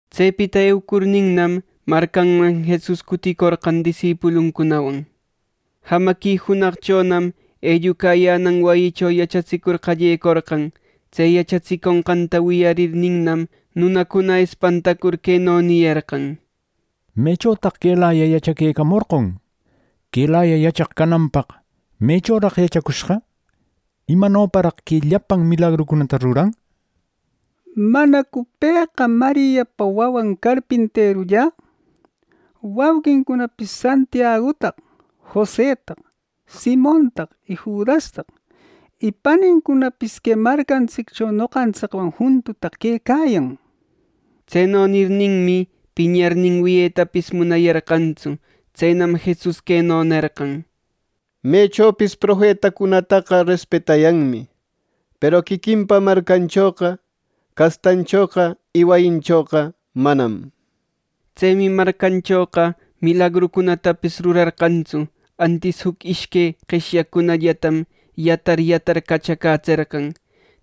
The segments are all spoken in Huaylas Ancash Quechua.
Tsepita eucurninnam, marcanman Jesus cuticorqan disipuluncunawan. Jamaqui junaqchonam ellucayänan wayicho yachatsicur qallecorqan. Tse yachatsiconqanta wiyarninnam, nunacuna espantacur queno niyarqan: —¡Mechotaq quelayaqa yachaquecamorqon! Quelaya yachaq cananpaq ¿mechoraq yachacushqa! ¿Imanoparaq que llapan milagrucunata ruran! ¿Manacu pëqa Mariapa wawan carpinterulla; wauqincunapis Santiagutaq, Josetaq, Simontaq y Judastaq! ¡Y panincunapis que marcantsiccho noqantsicwan juntutaq quecayan! —nir. Tseno nirninmi, piñarnin wiyetapis munayarqantsu. Tsenam Jesus queno nerqan: —Mechopis profetacunataqa respetayanmi, peru quiquinpa marcanchoqa, castanchoqa, y wayinchoqa manam —nir. Tsemi marcanchoqa milagrucunatapis rurarqantsu. Antis juc ishque qeshyaqcunallatam yatar, yatar cachacätserqan.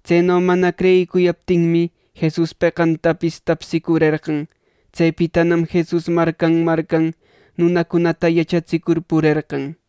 Tseno mana creyicuyaptinmi, Jesus peqantapis tapsicurerqan. Tsepitanam Jesus marcan marcan nunacunata yachatsicur purerqan.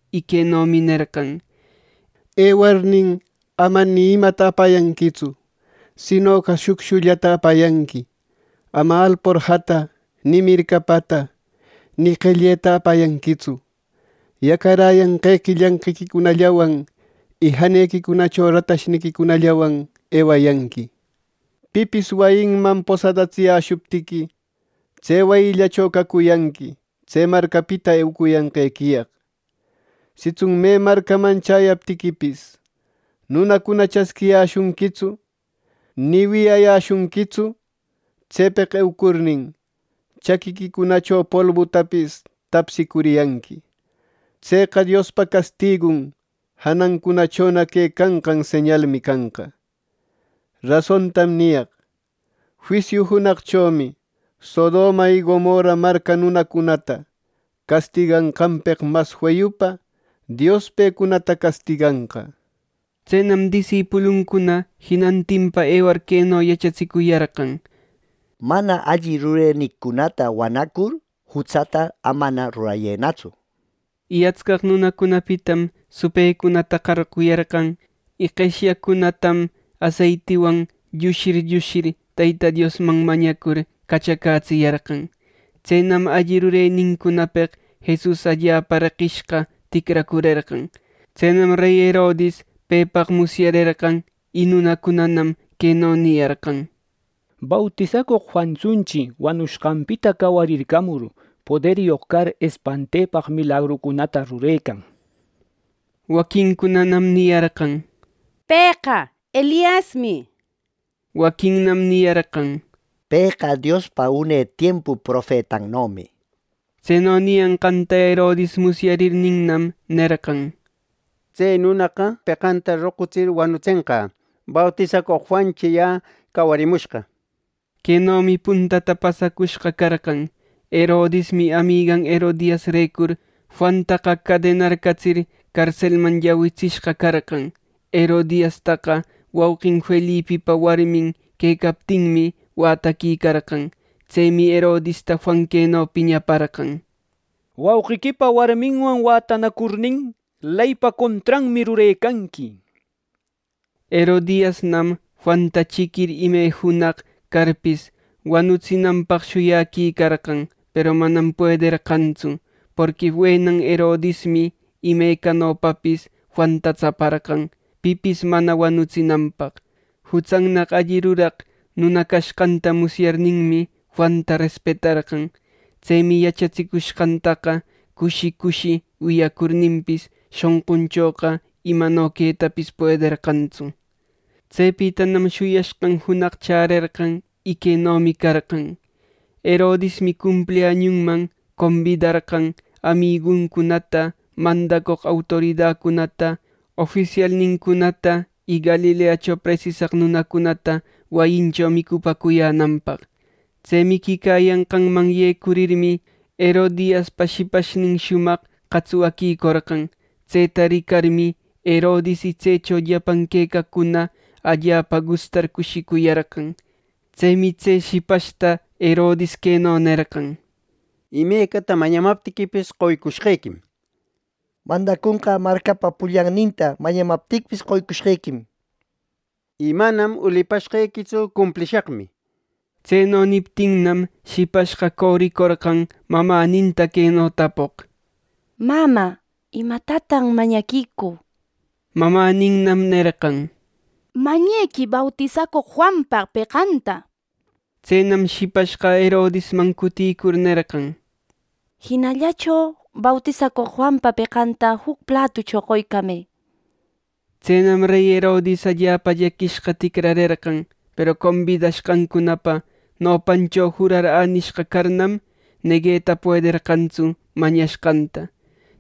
Y quenomi nerqan: —Ewarnin, ama ni imata apayanquitsu; sinoqa shucshullata apayanqui. Ama alporjata ni mircapata ni qelleta apayanquitsu. Yacaräyanqequi llanqiquicunallawan, y janequicunacho ratashniquicunallawan ewayanqui. Pipis wayinman posadatsiyäshuptiqui, tse wayillacho cacuyanqui tse marcapita eucuyanqequiyaq. Sitsun me marcaman chäyaptiquipis nunacuna chasquiyäshunquitsu, ni wiyayäshunquitsu; tsepeq eucurnin, chaquiquicunacho polbutapis tapsicuriyanqui. Tseqa Diospa castigun janancunachona quecanqan señalmi canqa. ˻Rasontam niyaq: Juisiu junaqchomi Sodoma y Gomorra marca nunacunata castiganqanpeq mas feyupa Dios pecunata castiganqa˼. Tsenam disipuluncuna jinantinpa ewar queno yachatsicuyarqan: —Mana alli rurenincunata wanacur, jutsata amana rurayënatsu —nishpa. Y atscaq nunacunapitam supëcunata qarquyarqan, y qeshyaqcunatam aseitiwan llushir, llushir ˻Teyta Diosman mañacur˼ cachacätsiyarqan. Tsenam alli rurenincunapeq Jesus allapa reqishqa ticracurerqan. Tsenam rey Herodis pepaq musyarerqan. Y nunacunanam queno niyarqan: —Bautisacoq Juantsunchi wanushqanpita cawarircamur, poderyoq car espantepaq milagrucunata rurecan —nir. Waquincunanam niyarqan: —Pëqa Eliasmi. Waquinnam niyarqan: —Pëqa Diospa une tiempu profetannomi —nir. Tseno niyanqanta Herodis musyarirninnam, nerqan: —Tse nunaqa peqanta roqutsir wanutsenqä bautisacoq Juanchi yä cawariramushqa —nir. Quenomi puntata pasacushqa carqan. Herodismi amigan Herodiasrecur Juanta cadenarcatsir carselman llawitsishqa carqan. Herodiastaqa wauqin Felipipa warmin quecaptinmi, wätaquicarqan. Tsemi Herodista Juan queno piñaparqan: —¡Wauqiquipa warminwan wätanacurnin, Leypa contranmi rurecanqui! —nir. Herodiasnam Juanta chiquir ime junaq carpis, wanutsinanpaq shuyaquicarqan. Peru manam puederqanraqtsu. Porqui wenan Herodismi imecanopapis Juanta tsaparqan pipis mana wanutsinanpaq. Jutsannaq alli ruraq nuna cashqanta musyarninmi, Juanta respetarqan. Tsemi yachatsicushqantaqa cushi, cushi wiyacurninpis, shonqunchoqa imano quetapis puederqantsu. Tsepitanam shuyashqan junaq chärerqan. Y quenomi carqan: Herodismi cumpliañunman combidarqan amiguncunata, mandacoq autoridacunata, ofisialnincunata y Galileacho presisaq nunacunata wayincho micupäcuyänanpaq. Tse miquicayanqanman yecurirmi, Herodiaspa shipashnin shumaq qatswaquicorqan. Tseta ricarmi, Herodis y tsecho llapan quecaqcuna allapa gustar cushicuyarqan. Tsemi tse shipashta Herodis queno nerqan: —Imecata mañamaptiquipis qoycushqequim. Mandacunqä marcapa pullanninta mañamaptiquipis, qoycushqequim. Y manam ulipashqequitsu; cumplishaqmi —nir. Tseno niptinnam, shipashqa coricorqan mamäninta queno tapoq: —Mamä, ¿Imatatan mañaquicü? —nir. Mamäninnam nerqan: —Mañequï bautisacoq Juanpa peqanta —nir. Tsenam shipashqa Herodisman cuticur nerqan: —Jinallacho bautisacoq Juanpa peqanta juc platucho qoycamë —nir. Tsenam rey Herodis allapa llaquishqa ticrarerqan; peru combidashqancunapa nopancho jurar änishqa carnam, negueta puederqantsu mañashqanta.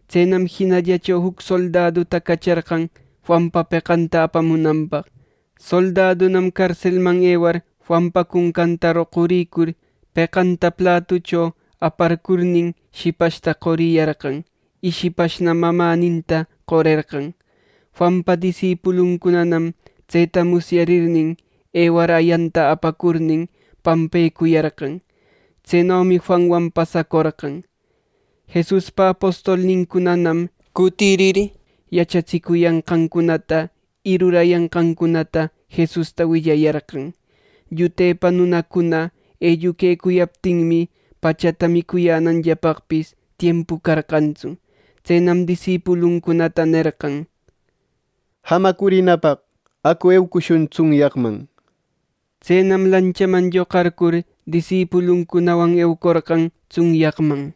Tsenam jinallacho juc soldaduta cacharqan Juanpa peqanta apamunanpaq. Soldadunam carselman ewar Juanpa cuncanta roqurïcur peqanta platucho aparcurnin, shipashta qoriyarqan, y shipashnam mamäninta qorerqan. Juanpa disipuluncunanam tseta musyarirnin, ewar ayanta apacurnin pampaquicuyarqan. ˻Tsenomi Juanwan pasacorqan.˼ Jesuspa apostolnincunanam cutirir, yachatsicuyanqancunata y rurayanqancunata Jesusta willayarqan. Llutepa nunacuna elluquecuyaptinmi, pachata micuyänanllapaqpis tiempu carqantsu. Tsenam disipuluncunata nerqan: —Jamacurinapaq acu eucushun tsunyaqman —nir. Tsenam lanchaman lloqarcur, disipuluncunawan eucorqan tsunyaqman.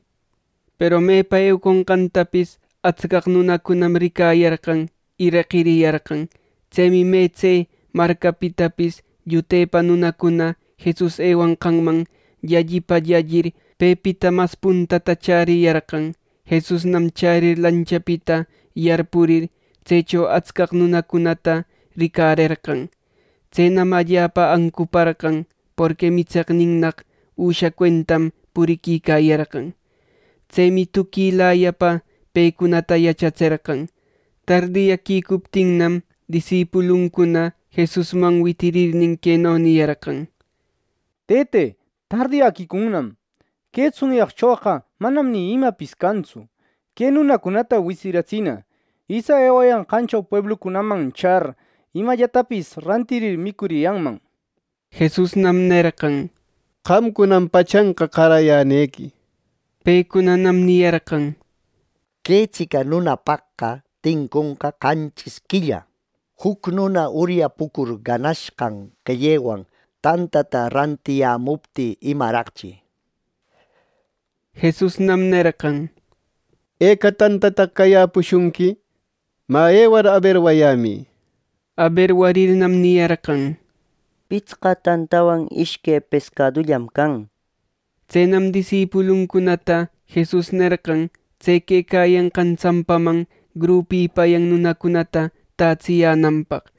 Peru mepa euconqantapis atscaq nunacunam ricayarqan y reqiriyarqan. Tsemi me tse marcapitapis llutepa nunacuna Jesus ewanqanman llallipa llallir, pepita mas puntata chäriyarqan. Jesusnam chärir lanchapita yarpurir, tsecho atscaq nunacunata ricarerqan. Tsenam allapa ancuparqan, porqui mitseqninnaq üsha cuentam puriquicayarqan. Tsemi tuquilayapa pecunata yachatserqan Tardiyäquicuptinnam, disipuluncuna Jesusman witirirnin, queno niyarqan: —Tëte, tardiyäquicunnam. Que tsunyaqchoqa manam ni imapis cantsu. Que nunacunata witsiratsina itsa ewayanqancho pueblucunam char, imallatapis rantirir micuriyanman. Jesusnam nerqan: —Qamcunam pachanqa qarayänequi. Pecunanam niyarqan: —Que tsica nunapaqqa tinconqa qanchis quilla juc nuna uryapucur ganashqan qellewan tantata rantiyämuptï, ¡imaraqchi! Jesusnam nerqan: —¿Eca tantataq cayäpushunqui? Mä, ewar aberwayämï. Aberwarirnam, niyarqan: —Pitsqa tantawan ishque pescadullam can —nishpa Tsenam disipuluncunata Jesus nerqan tse quecayanqan tsampaman grupipayan nunacunata tätsiyänanpaq.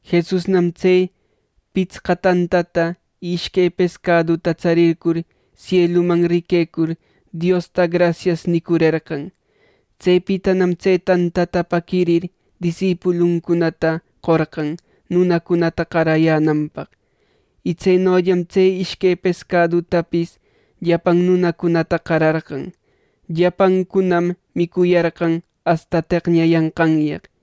Jesusnam tse pitsqa tantata y ishque pescaduta tsarircur sieluman riquecur, Diosta “Grasias” nicurerqan. Tsepitanam tse tantata paquirir disipuluncunata qorqan nunacunata qarayänanpaq. Y tsenollam tse ishque pescadutapis llapan nunacunata qararqan. Llapancunam micuyarqan asta teqñayanqanyaq,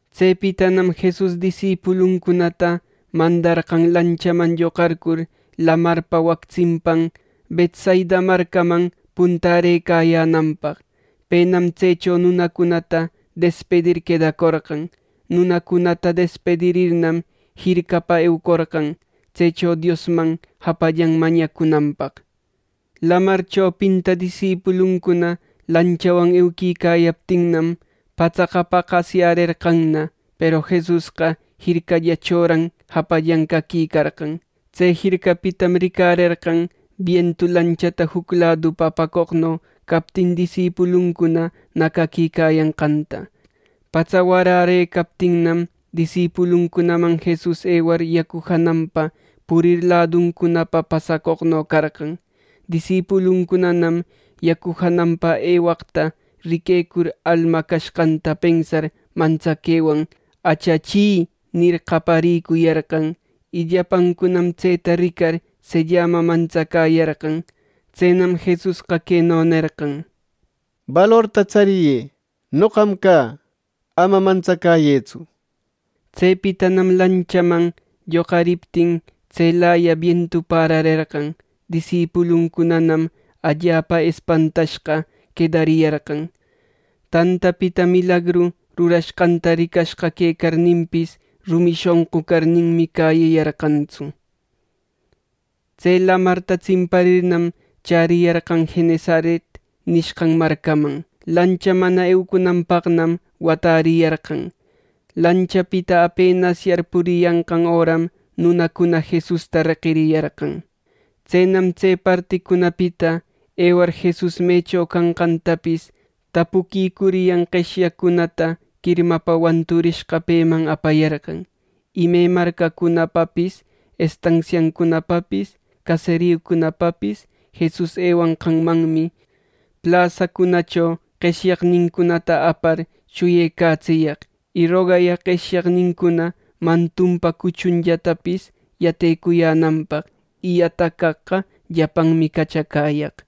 Tsepitanam Jesus disipuluncunata mandarqan lanchaman lloqarcur lamarpa wac tsimpan Betsaida marcaman puntärëcayänanpaq. Penam tsecho nunacunata despidir quedacorqan. Nunacunata despidirirnam jircapa eucorqan, tsecho Diosman japallan mañacunanpaq Lamar chopinta disipuluncuna lanchawan euquicayaptinnam, patsaqa paqasyärerqanna. Peru Jesusqa jircallachoran japallan caquicarqan. Tse jircapitam ricarerqan bientu lanchata juc ladupa apacoqno captin disipuluncuna nacaquicayanqanta. Patsa warärëcaptinnam, disipuluncunaman Jesus ewar yacu jananpa purir laduncunapa pasacoqno carqan. Disipuluncunanam yacu jananpa ewaqta riquecur, alma cashqanta pensar mantsaquewan “¡Achachi!” nir, qayarïcuyarqan. Y llapancunam tseta ricar sellama mantsacäyarqan. Tsenam Jesusqa queno nerqan: —Balorta tsariyë. Noqam cä. Ama mantsacäyëtsu —nir. Tsepitanam lanchaman lloqariptin, tselaya bientu pärarerqan. Disipuluncunanam allapa espantashqa quedariyarqan. Tantapita milagru rurashqanta ricashqa quecarninpis, rumi shonqu carninmi cäyiyarqantsu. Tse lamarta tsimparirnam, chäriyarqan Genesaret nishqan marcaman. Lancha mana eucunanpaqnam watariyarqan. Lanchapita apenas yarpuriyanqan öram nunacuna Jesusta reqiriyarqan. Tsenam tse particunapita ewar Jesus mecho canqantapis tapuquicuryan qeshyaqcunata quirmapa wanturishqa peman apayarqan. Y me marcacunapapis, estansiacunapapis, caseriucunapapis Jesus ewanqanmanmi plasacunacho qeshyaqnincunata apar shuyecatsiyaq. Y rogayaq qeshyaqnincuna mantunpa cuchunllatapis yatecuyänanpaq. Y yataq caqqa llapanmi cachacäyaq.